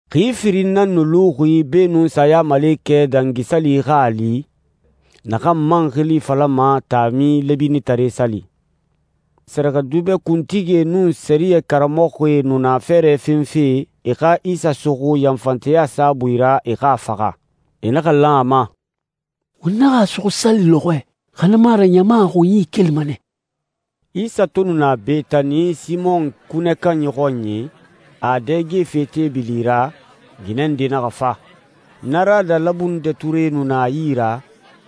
Xi firin nan nu luxi beenun Sayamalekɛ Dangi Sali xa a li, naxan man xili falama Taami Lɛbinitare Sali. Sɛrɛxɛdubɛ kuntigie nun sɛriyɛ karamɔxɔe nu na fɛɛrɛ fenfe e xa Isa suxu yanfanteya saabui ra, e xa a faxa. E naxa lan a ma, «Won naxa a suxu sali lɔxɔɛ, xa na mu a ra ɲama a xunyi kelima nɛ.» Isa to nu na Betani, Simɔn kunɛ kanyi xɔnyi, a a dɛgefe teebili ra, ginɛ nde naxa fa. Narada labundɛ ture nu na a yi ra,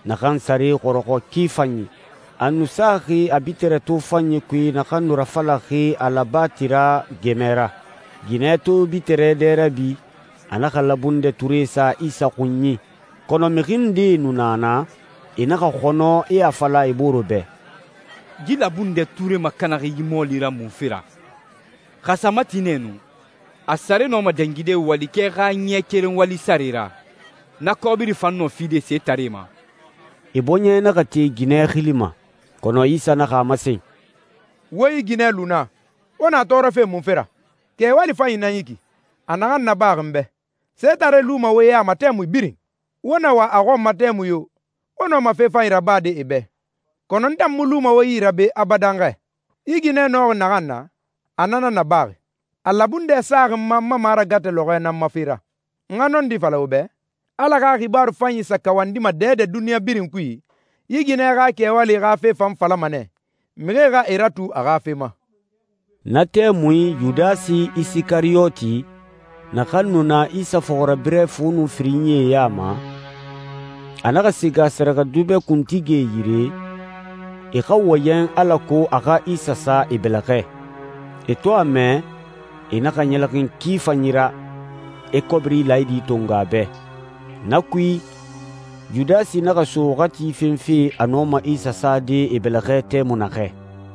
naxan sare xɔrɔxɔ ki fanyi. A nu saxi a bitirɛ tofanyi kui naxan nu rafalaxi alabatira gɛmɛ ra. Ginɛ to bitirɛ dɛ rabi, a naxa labundɛ ture sa Isa xunyi. Kɔnɔ mixi ndee nu na naa, e naxa xɔnɔ, e a fala e bore bɛ, «Yi labundɛ ture makanaxi yi mɔɔli ra munfe ra? Xa a sa mati nɛ nu, a sare nɔma dangide walikɛ xa ɲɛ keren wali sare ra, na kɔbiri fan nɔ fide setaree ma.» E bɔɲɛ naxa te ginɛ xili ma. Kɔnɔ Isa naxa a masen, «Wo yi ginɛ lu na. Wo na a tɔɔrɔfe munfe ra? Kɛwali fanyi nan yi ki, a naxan nabaxi n bɛ. Setaree luma nɛ wo ya ma tɛmui birin. Wo na wa a xɔn ma tɛmui yo, wo nɔma fe fanyi rabade e bɛ, kɔnɔ n tan mu luma wo yi ra be abadan xɛ. Yi ginɛ nɔxi naxan na, a na nan nabaxi. A labundɛ saxi n ma n ma maragatɛ lɔxɔɛ nan ma fe ra. N xa nɔndi fala wo bɛ, Ala xa xibaaru fanyi sa kawandima dɛdɛ duniɲa birin kui, yi ginɛ xa kɛwali xa fe fan falama nɛ, mixie xa e ratu a xa fe ma.» Na tɛmui, Yudasi Isikariyoti, naxan nu na Isa fɔxirabirɛ fu nun firinyie ya ma, a naxa siga sɛrɛxɛdubɛ kuntigie yire, e xa wɔyɛn alako a xa Isa sa e bɛlɛxɛ. E to a mɛ, e naxa ɲɛlɛxin ki fanyi ra, e kɔbiri laayidi tongo a bɛ. Na kui, Yudasi naxa so waxati fenfe a nɔma Isa sade e bɛlɛxɛ tɛmui naxɛ.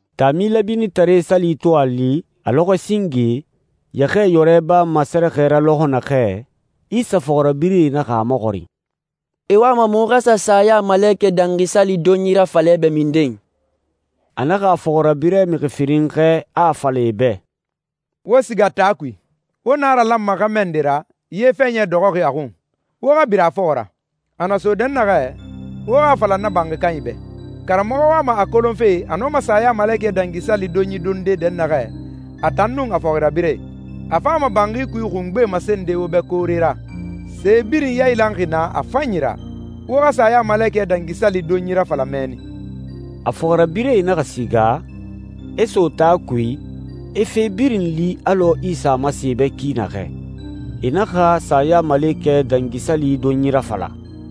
Taami Lɛbinitare Sali to a li, a lɔxɔɛ singe, yɛxɛɛyɔrɛ bama sɛrɛxɛ ra lɔxɔ naxɛ, Isa fɔxirabirɛe naxa a maxɔrin, «I wama muxu xa sa Sayamalekɛ Dangi Sali donyi rafala i bɛ minden?» A naxa a fɔxirabirɛ mixi firin xɛɛ, a a fala e bɛ, «Wo siga taa kui. Wo naralanma xɛmɛ nde ra, ye fɛɲɛ dɔxɔxi a xun. Wo xa bira a fɔxɔ ra. A na so dɛnnaxɛ, wo xa a fala na banxi kanyi bɛ, ‹Karamɔxɔ wama a kolonfe a nɔma Sayamalekɛ Dangi Sali donyi donde dɛnnaxɛ, a tan nun a fɔxirabirɛe.› A fama banxi kui xungbe masende wo bɛ koore ra, se birin yailanxi naa a fanyi ra. Wo xa Sayamalekɛ Dangi Sali donyi rafala mɛnni.» A fɔxirabirɛe naxa siga, e so taa kui, e fe birin li alɔ Isa a masen e bɛ ki naxɛ. E naxa Sayamalekɛ Dangi Sali donyi rafala.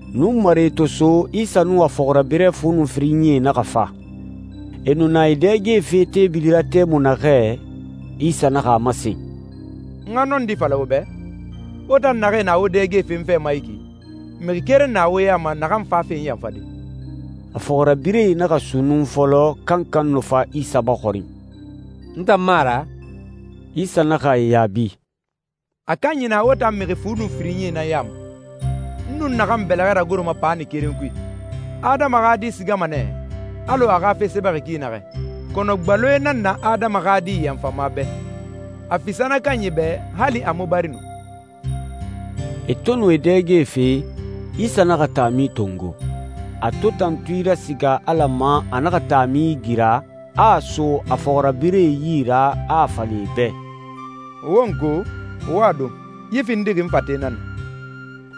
Nunmare to so, Isa nun a fɔxirabirɛ fu nun firinyie naxa fa. E nu na e dɛgefe teebili ra tɛmui naxɛ, Isa naxa a masen, «N xa nɔndi fala wo bɛ, wo tan naxee na wo dɛgefe n fɛ ma yi ki, mixi keren na wo ya ma naxan fafe n yanfade.» A fɔxirabirɛe naxa sunnun fɔlɔ, kankan nu fa Isa maxɔrin, «N tan mu a ra?» Isa naxa e yaabi, «A kanyi na wo tan mixi fu nun firinyie ya ma, n nun naxan bɛlɛxɛ ragoroma paani keren kui. Adama xa Di sigama nɛ alɔ a xa fe sɛbɛxi ki naxɛ, kɔnɔ gbaloe nan na Adama xa Di yanfama bɛ. A fisa na kanyi bɛ hali a mu bari nu.» E to nu e dɛgefe, Isa naxa taami tongo. A to tantui rasiga Ala ma, a naxa taami igira, a a so a fɔxirabirɛe yi ra, a a fala e bɛ, «Wo n ko, wo a don. Yi findixi n fate nan na.»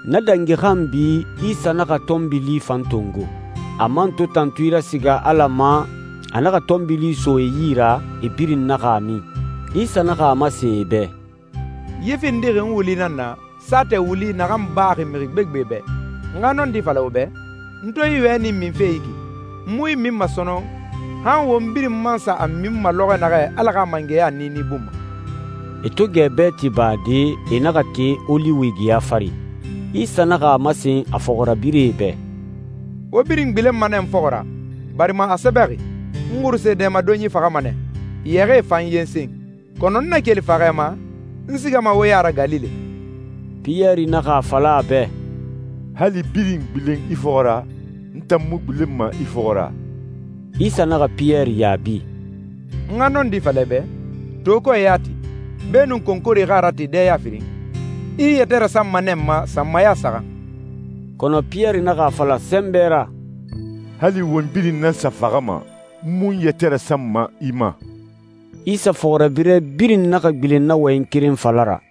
Na dangi xanbi, Isa naxa tɔnbili fan tongo. A man to tantui rasiga Ala ma, a naxa tɔnbili so e yi ra, e birin naxa a min. Isa naxa a masen e bɛ, «Yi findixi n wuli nan na, saatɛ wuli naxan baxi mixi gbegbe bɛ. N xa nɔndi fala wo bɛ, n to yi wɛni minfe yi ki, n mu yi minma sɔnɔn, han won birin man sa a minma lɔxɔ naxɛ Ala xa mangɛya niini bun ma.» E to gɛ bɛɛti bade, e naxa te Oliwi geya fari. Isa naxa a masen a fɔxirabirɛe bɛ, «Wo birin gbilenma nɛ n fɔxɔ ra, barima a sɛbɛxi, ‹N xuruse dɛmadonyi faxama nɛ, yɛxɛɛe fan yensen.› Kɔnɔ n na keli faxɛ ma, n sigama wo ya ra Galile.» Piyɛri naxa a fala a bɛ, «Hali birin gbilen i fɔxɔ ra, n tan mu gbilenma i fɔxɔ ra!» Isa naxa Piyɛri yaabi, «N xa nɔndi fala i bɛ, to kɔɛ yati, beenun konkore xa a rate dɛya firin, i i yɛtɛ rasanma nɛ n ma sanmaya saxan.» Kɔnɔ Piyɛri naxa a fala sɛnbɛ ra, «Hali won birin nan sa faxama, n mu n yɛtɛ rasanma i ma!» Isa fɔxirabirɛ birin naxa gbilen na wɔyɛn keren fala ra.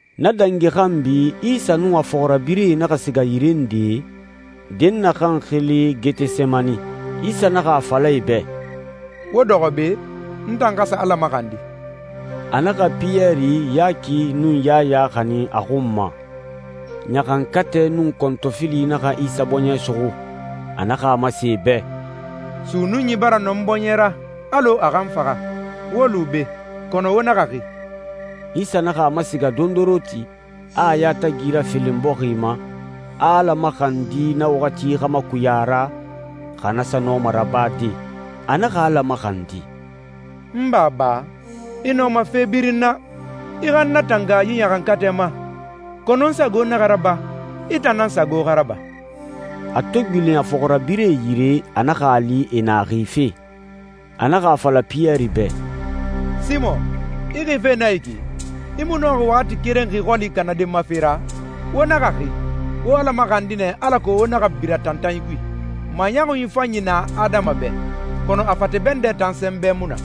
Na dangi xanbi Isa nun a fɔxirabirɛe naxa siga yire nde, dɛnnaxɛ xili Getesemani. Isa naxa a fala e bɛ, «Wo dɔxɔ be. N tan xa sa Ala maxandi.» A naxa Piyɛri, Yaki, nun Yaya xanin a xun ma. Ɲaxankatɛ nun kɔntɔfili naxa Isa bɔɲɛ suxu. A naxa a masen e bɛ, «Sunnunyi bara nɔ n bɔɲɛ ra alɔ a xa n faxa. Wo lu be, kɔnɔ wo naxa xi.» Isa naxa a masiga dondoronti, a a yatagi rafelen bɔxi ma, a Ala maxandi na waxati xa makuya a ra, xa na sa nɔma rabade. A naxa Ala maxandi, «N Baba, i nɔma fe birin na. I xa n natanga yi ɲaxankatɛ ma. Kɔnɔ n sago naxa raba, i tan nan sago xa raba.» A to gbilen a fɔxirabirɛe yire, a naxa e li e na xife. A naxa a fala Piyɛri bɛ, «Simɔn, i xife nɛ yi ki? I mu nɔxi waxati keren xi xɔli kanade n ma fe ra? Wo naxa xi. Wo Ala maxandi nɛ alako wo naxa bira tantanyi kui. Maɲɔxun fanyi na adama bɛ, kɔnɔ a fate bɛndɛ tan sɛnbɛ mu na.»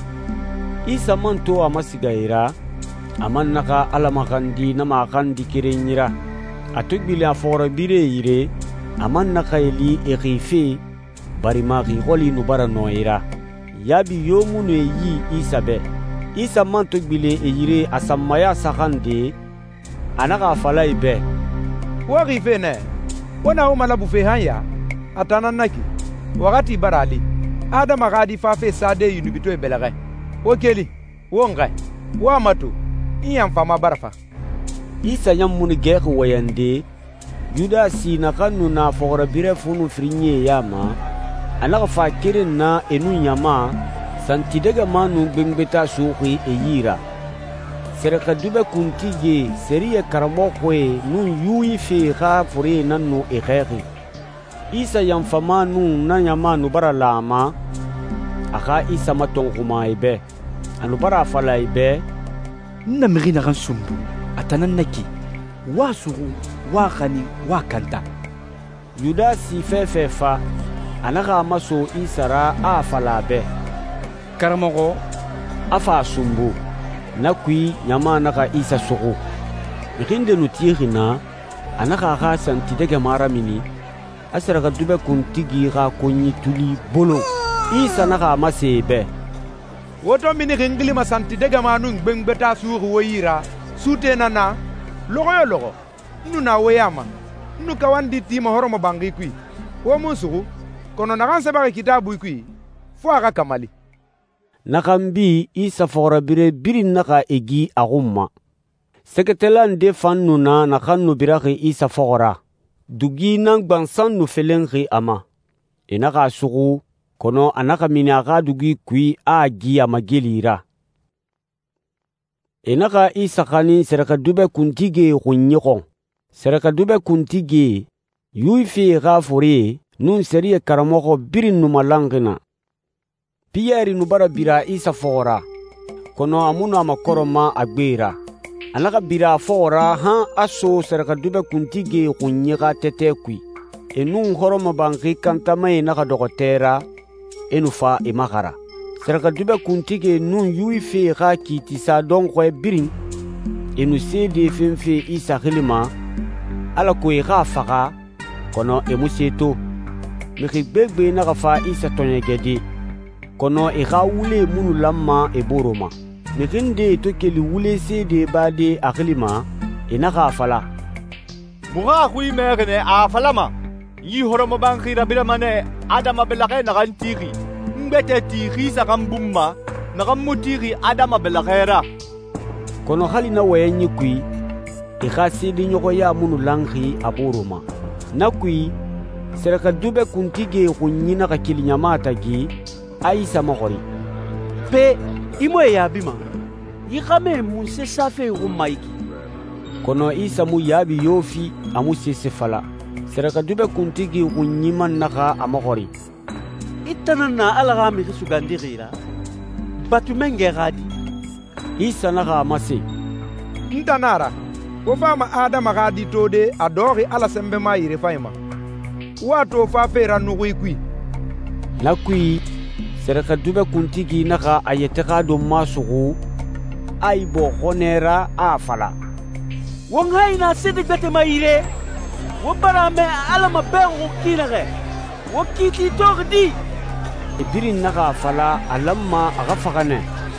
Isa man to a masiga e ra, a man naxa Ala maxandi na maxandi kerenyi ra. A to gbilen a fɔxirabirɛe yire, a man naxa e li e xife, barima xi xɔli nu bara nɔ e ra. Yaabi yo mu nu e yi Isa bɛ. Isa man to gbilen e yire a sanmaya saxan nde, a naxa a fala e bɛ, «Wo xife nɛ? Wo na wo malabufe han ya? A tan nan na ki, waxati bara a li. Adama xa Di fafe sade yunubitɔɛe bɛlɛxɛ. Wo keli, won xɛɛ. Wo a mato, n yanfama bara fa.» Isa ɲan mu nu gɛxi wɔyɛnde, Yudasi, naxan nu na a fɔxirabirɛ fu nun firinyie ya ma, a naxa fa keren na e nun ɲama, santidɛgɛma nun gbengbeta suxuxi e yi ra. Sɛrɛxɛdubɛ kuntigie, sɛriyɛ karamɔxɔe, nun Yuwifie xa forie nan nu e xɛɛxi. Isa yanfama nun na ɲama nu bara lan a ma, a xa Isa matɔnxuma e bɛ. A nu bara a fala e bɛ, «N na mixi naxan sunbu, a tan nan na ki. Wo a suxu, wo a xanin, wo a kanta.» Yudasi fɛfɛ fa, a naxa a maso Isa ra, a a fala a bɛ, «Karamɔxɔ,» a fa a sunbu. Na kui, ɲama naxa Isa suxu. Mixi nde nu tixi naa, a naxa a xa santidɛgɛma ramini, a sɛrɛxɛdubɛ kuntigi xa konyi tuli bolon. Isa naxa a masen e bɛ, «Wo to minixi n xili ma santidɛgɛma nun gbengbeta suxuxi wo yi ra, suute nan na n na? Lɔxɔ yo lɔxɔ, n nu na wo ya ma, n nu kawandi ti hɔrɔmɔbanxi kui, wo mu n suxu. Kɔnɔ naxan sɛbɛxi Kitaabui kui, fo a xa kamali.» Na xanbi, Isa fɔxirabirɛe birin naxa e gi a xun ma. Sɛgɛtala nde fan nu na naxan nu biraxi Isa fɔxɔ ra, dugi nan gbansan nu felenxi a ma. E naxa a suxu, kɔnɔ a naxa mini a xa dugi kui, a a gi a mageli ra. E naxa Isa xanin sɛrɛxɛdubɛ kuntigie xunyi xɔn. Sɛrɛxɛdubɛe kuntigie, Yuwifie xa forie, nun sɛriyɛ karamɔxɔ birin nu malanxi naa. Piyɛri nu bara bira Isa fɔxɔ ra, kɔnɔ a mu nu a makɔrɛma a gbe ra. A naxa bira a fɔxɔ ra han a so sɛrɛxɛdubɛ kuntigie xunyi xa tɛtɛ kui. E nun hɔrɔmɔbanxi kantamae naxa dɔxɔ tɛ ra, e nu fa e maxara. Sɛrɛxɛdubɛ kuntigie nun Yuwifie xa kiitisa dɔnxɔɛ birin, e nu seede fenfe Isa xili ma, alako e xa a faxa, kɔnɔ e mu se to. Mixi gbegbe naxa fa Isa tɔɔɲɛgɛde, kɔnɔ e xa wulee mu nu lanma e boore ma. Mixi ndee to keli wule seede bade a xili ma, e naxa a fala, «Muxu a xui mɛxi nɛ, a a falama, ‹N yi hɔrɔmɔbanxi rabirama nɛ, adama bɛlɛxɛ naxan tixi, n gbɛtɛ ti xi saxan bun ma, naxan mu tixi adama bɛlɛxɛ ra.›» Kɔnɔ hali na wɔyɛnyi kui, e xa seedeɲɔxɔya mu nu lanxi a boore ma. Na kui, sɛrɛxɛdubɛ kuntigie xunyi naxa keli ɲama tagi, a Isa maxɔrin, «Pe, i mu e yaabima? Yi xɛmɛe munse safe i xun ma yi ki?» Kɔnɔ Isa mu yaabi yo fi, a mu sese fala. Sɛrɛxɛdubɛ kuntigi xunyi man naxa a maxɔrin, «I tan nan na Ala xa Mixi Sugandixi ra, Batu Mangɛ xa Di?» Isa naxa a masen, «N tan nan na a ra. Wo fama Adama xa Di tode, a dɔxɔxi Ala Sɛnbɛma yirefanyi ma, wo a to fafe ra nuxuie kui.» Na kui, sɛrɛxɛdubɛ kuntigi naxa a yɛtɛ xa donma suxu, a ibɔɔ xɔnɛ ra, a a fala, «Won hayi na seede gbɛtɛe ma yire? Wo bara a mɛ a Ala mabɛxuxi ki naxɛ! Wo kiiti toxi di?» E birin naxa a fala a lanma a xa faxa nɛ.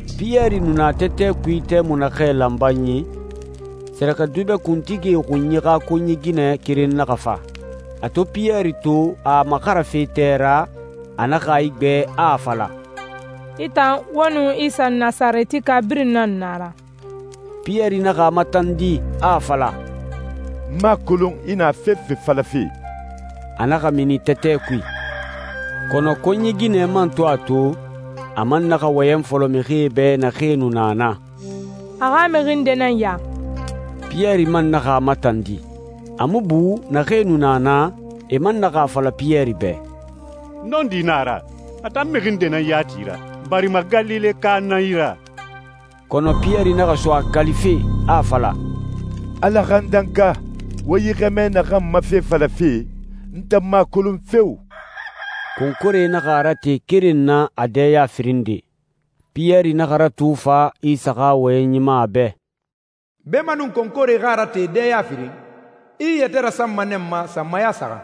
Piyɛri nu na tɛtɛ kui tɛmui naxɛ lanbanyi, sɛrɛxɛdubɛ kuntigie xunyi xa konyi ginɛ keren naxa fa. A to Piyɛri to, a a maxarafe tɛ ra, a naxa a igbɛ, a a fala, «I tan, wo nun Isa Nasarɛtika birin nan nu a ra.» Piyɛri naxa a matandi, a a fala, «N mu a kolon i na fefe falafe!» A naxa mini tɛtɛ kui. Kɔnɔ konyi ginɛ man to a to, a man naxa wɔyɛn fɔlɔ mixie bɛ naxee nu na naa, «A xa mixi nde nan ya.» Piyɛri man naxa a matandi. A mu bu, naxee nu na naa, e man naxa a fala Piyɛri bɛ, «Nɔndi na a ra, a tan mixi nde nan yati i ra, barima Galileka nan i ra.» Kɔnɔ Piyɛri naxa so a kalife, a a fala «Ala xa n danka! Wo yi xɛmɛ naxan ma fe falafe, n tan mu a kolon feo!» Konkore naxa a rate keren na a dɛya firin nde. Piyɛri naxa ratu fa Isa xa wɔyɛnyi ma a bɛ, «Beemanun konkore xa a rate dɛya firin, i i yɛtɛ rasanma nɛ n ma sanmaya saxan.»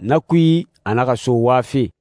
Na kui, a naxa so wafe.